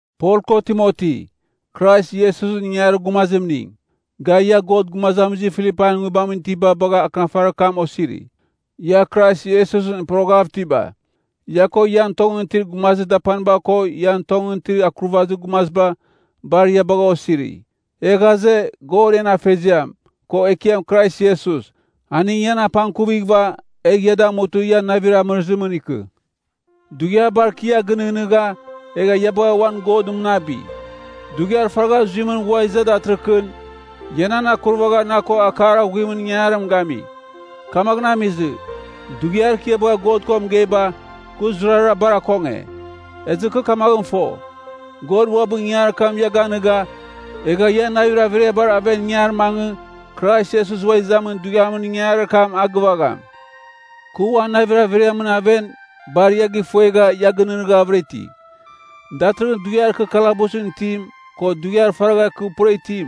Pol ko Timoti, Krais Iesusɨn ingangarir gumazimning, ga, ia Godɨn gumazamizir Filipain nguibamɨn itiba bagha akɨnafarir kam osiri, ia Krais Iesusɨn poroghav itiba. Ia ko ian tongɨn itir gumazir dapaniba ko ian tongɨn itir akurvazir gumaziba, bar ia bagha osiri. E ghaze, God en Afeziam, ko Ekiam Krais Iesus, aning ian apangkuvighɨva, egh ia damutɨ ia navir amɨrɨzimɨn ikɨ. Dughiabar kɨ ia gɨnɨghnɨgha, egha ia bagha uan God mɨnabi. Dughiar faragha zuimɨn ghua iza datɨrɨkɨn, ia nan akurvagha na ko akar aghuimɨn ingangarim gami. Kamaghɨn amizɨ, dughiar kɨ ia bagha God ko mɨgeiba, kɨ zurara bar akonge. Ezɨ kɨ kamaghɨn fo, God uabɨ ingangarir kam ia ganɨga, egha ian navir averiabar aven ingar mangɨ, Krais Iesus Ua Izamin Dughiamɨn ingangarir kam a gɨvagham. Kɨ uan navir averiamɨn aven bar ia gifuegha ia gɨnɨghnɨghavɨra iti. Datɨrɨghɨn dughiar kɨ kalabusɨn itim, ko dughiar faragha kɨ pura itim,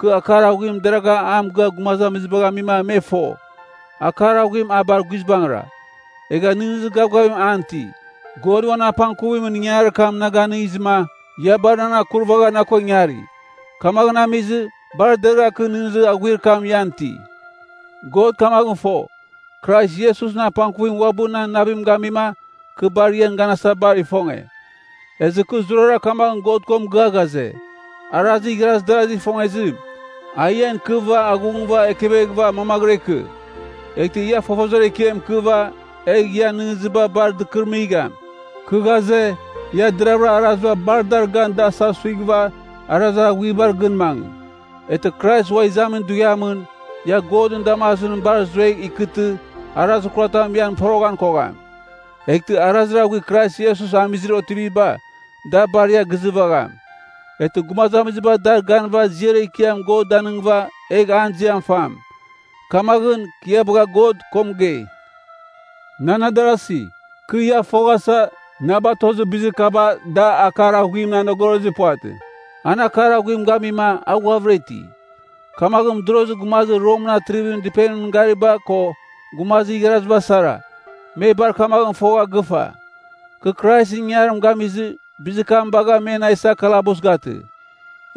kɨ akar aghuim deragha a mɨgɨa gumazamizibagh amima me fo, akar aghuim a bar guizbangɨra, egha nɨghnɨzir gavgavim an iti. God uan apangkuvimɨn ingangarir kam na ganɨngizɨma, ia bar nan akurvagha na ko ingari. Kamaghɨn amizɨ, bar deragha kɨ nɨghnɨzir aghuir kam ian iti. God kamaghɨn fo, Krais Iesusɨn apangkuvim uabɨ nan navim gamima kɨ bar ian ganasa bar ifonge. Ezɨ kɨ zurara kamaghɨn God ko mɨgɨa ghaze, arazir igharazir darazigh ifongezim, a ian ikɨva aghungɨva ekeveghɨva mangvɨra ikɨ. Eghtɨ ia fofozir ekiam ikɨva, egh ian nɨghnɨziba bar dɨkɨrɨmigham. Kɨ ghaze, ia deravɨra araziba bar dar gan da asavsuighɨva arazir aghuibar gɨn mangɨ. Eghtɨ Krais Ua Izamin Dughiamɨn, ia Godɨn damazimɨn bar zuegh ikɨtɨ arazir kuratam ian poroghan kogham. Eghtɨ arazir aghuir Krais Iesus amizir otiviba, da bar ia gizɨvagham. Eghtɨ gumazamiziba dar ganɨva ziar ekiam God danɨngɨva egh an ziam fam. Kamaghɨn, kɨ ia bagha God ko mɨgei. Nan adarasi, kɨ ia foghasa, na batozir bizir kaba da akar aghuimɨn anogorozir puvatɨ. An akar aghuim gamima a ghuavɨra iti. Kamaghɨn mɨdorozir gumazir Romɨn atrivimɨn dɨpenimɨn gariba ko gumazir igharaziba sara, me bar kamaghɨn fogha gɨfa, kɨ Kraisɨn ingangarim gamizɨ, bizir kam bagha me na isa kalabus gatɨ.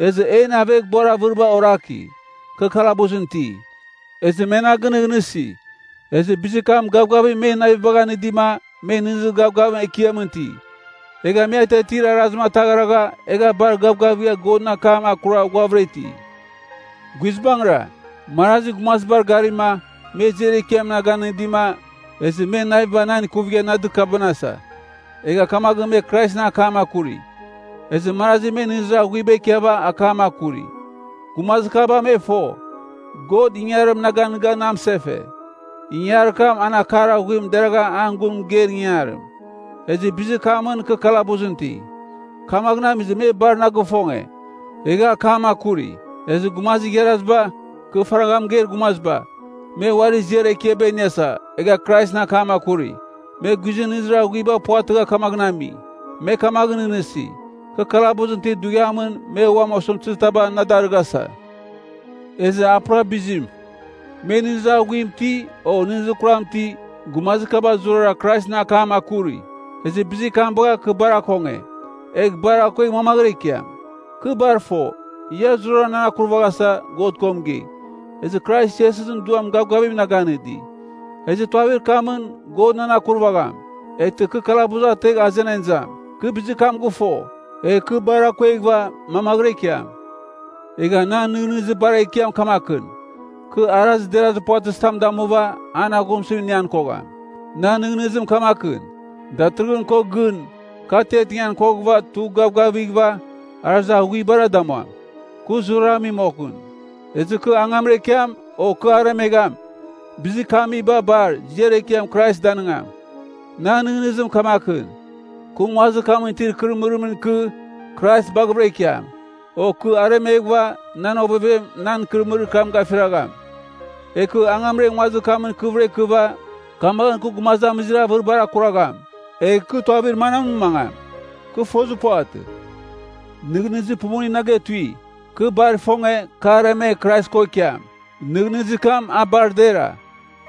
Ezɨ en aveghbuar avɨriba oraki, kɨ kalabusɨn iti, ezɨ me na gɨnɨghnɨsi. Ezɨ bizir kam gavgavim men navibagh anɨdima me nɨghnɨzir gavgavim Ekiamɨn iti. Egha me atiatir arazim ataghragha egha bar gavgavigha Godɨn akam akura ghuavɨra iti. Guizbangɨra, marazi gumazibar garima, me ziar ekiam na ganɨdima, ezɨ men naviba nan ikuvigha na dɨkabɨnasa. Egha kamaghɨn me Kraisɨn akam akuri. Ezɨ marazi me nɨghnɨzir aghuiba ikiava akam akuri. Gumazir kaba me fo, God ingangarim na ganɨga na mɨsefe, ingangarir kam an akar aghuim deragha an gun mɨgeir ingangarim, ezɨ bizir kamɨn kɨ kalabusɨn iti. Kamaghɨn amizɨ me bar na gifonge, egha akam akuri. Ezɨ gumazir igharaziba, kɨ faragha mɨgeir gumaziba, me uari ziar ekiaba iniasa, egha Kraisɨn akam akuri. Me guizɨn nɨghnɨzir aghuiba puvatɨgha kamaghɨn ami. Me kamaghɨn nɨghnɨsi, kɨ kalabusɨn itir dughiamɨn me uam osɨmtɨzir taba na darɨghasa. Ezɨ a pura bizim. Me nɨghnɨzir aghuim iti, o nɨghnɨzir kuram iti, gumazir kaba zurara Kraisɨn akam akuri. Ezɨ bizir kam bagha kɨ bar akonge. Egh bar akuegh mamaghɨra ikiam. Kɨ bar fo, ia zurara nan akurvaghasa God ko mɨgei, ezɨ Krais Iesusɨn Duam gavgavim na ganɨdi. Ezɨ tuavir kamɨn God nan akurvagham, eghtɨ kɨ kalabus ategh azenan izam. Kɨ bizir kam gɨfo, egh kɨ bar akueghɨva mamaghɨra ikiam. Egha nan nɨghnɨzir bar ekiam kamakɨn, kɨ arazir derazir puvatɨzitam damuva an aghumsɨzim inian kogham. Puvatɨ. Nan nɨghnɨzim kamakɨn, datɨrɨghɨn ko gɨn kɨ atiatingan koghɨva tugh gavgavighɨva arazir aghuibara damuam, kɨ zurara ami moghɨn. Ezɨ kɨ angamra ikiam o kɨ aremegham, bizir kɨ amiba bar, ziar ekiam Krais danɨngam. Nan nɨghnɨzim kamakɨn, kɨ nguazir kamɨn itir ikɨrɨmɨrimɨn ikɨ, Krais baghavɨra ikiam. O kɨ aremeghɨva, nan ovevem nan ikɨrɨmɨrir kam gafiragham. Egh kɨ angamra nguazir kamɨn ikɨvɨra ikɨva, kamaghɨn kɨ gumazamizir avɨribar akuragham. Egh kɨ tuavir manamɨn mangam? Kɨ fozir puvatɨ. Nɨghnɨzir pumuning na getui. Kɨ bar ifonge, kɨ aremegh Krais ko ikiam. Nɨghnɨzir kam a bar dera.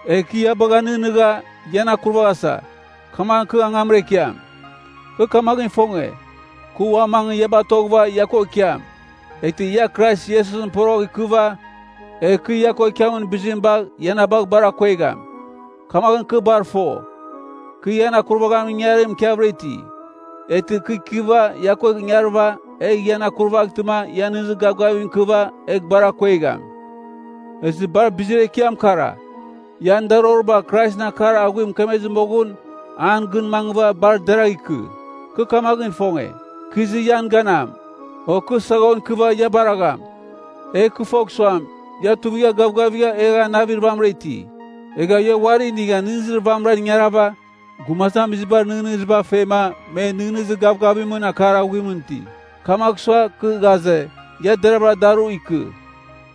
Egh kɨ ia baghava nɨghnɨgha, ian akuraghasa, kamaghɨn kɨ angamra ikiam. Kɨ kamaghɨn ifonge, kɨ ua mangɨ ia batoghɨva ia ko ikiam, eghtɨ ia Krais Iesusɨn poroghɨv ikɨva egh kɨ ia ko ikiamin bizim bagh ia na bagh bar akuegham. Kamaghɨn kɨ bar fo, kɨ ian akurvaghamin ingangarim ikiavɨra iti. Eghtɨ kɨ ikɨva ia ko ingarɨva, egh ian akurvaghtɨma ia nɨghnɨzir gavgavim ikɨva egh bar akuegham. Ezɨ bar bizir ekiam kara, ian daroriba Kraisɨn akar aghuim mɨkemezɨ moghɨn an gɨn mangɨva bar deragh ikɨ. Kɨ kamaghɨn ifonge, kɨ izɨ ian ganam, o kɨ saghon ikɨva ia baragham, egh kɨ fogh suam, ia tuivigha gavgavigha egha navir vamɨra iti. Egha ia uari inigha nɨghnɨzir vamɨran ingarava, gumazamizibar nɨghnɨziba fema me nɨghnɨzir gavgavimɨn akar aghuimɨn iti. Kamagh sua, kɨ ghaze, ia deravɨra daru ikɨ.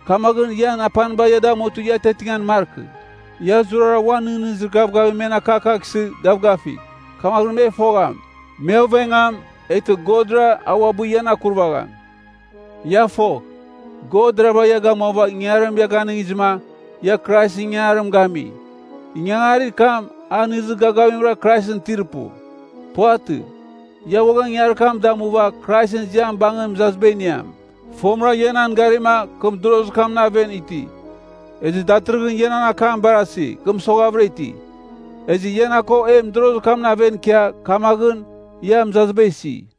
Kamaghɨn, ian apaniba ia damutɨ ia atiatingan markɨ. Ia zurara uan nɨghnɨzir gavgavim men akakaghsɨ gavgafigh. Kamaghɨn me fogham, me ovengam, eghtɨ Godra, a uabɨ ian akurvagham. Ia fogh, God deravɨra ia gamuava ingangarim ia ganɨngizɨma, ia Kraisɨn ingangarim gami. Ingangarir kam, a nɨghnɨzir gavgavimra Kraisɨn itir pu. Puvatɨ. Ia uaghan ingangarir kam damuva Kraisɨn ziam bangɨn mɨzaziba iniam. Fomɨra ia nan garima kɨ mɨdorozir kamɨn aven iti. Ezɨ datɨrɨghɨn ia nan akam barasi, kɨ mɨsoghavɨra iti. Ezɨ ia na ko e mɨdorozir kamɨn aven ikia, kamaghɨn, ia mɨzaziba isi.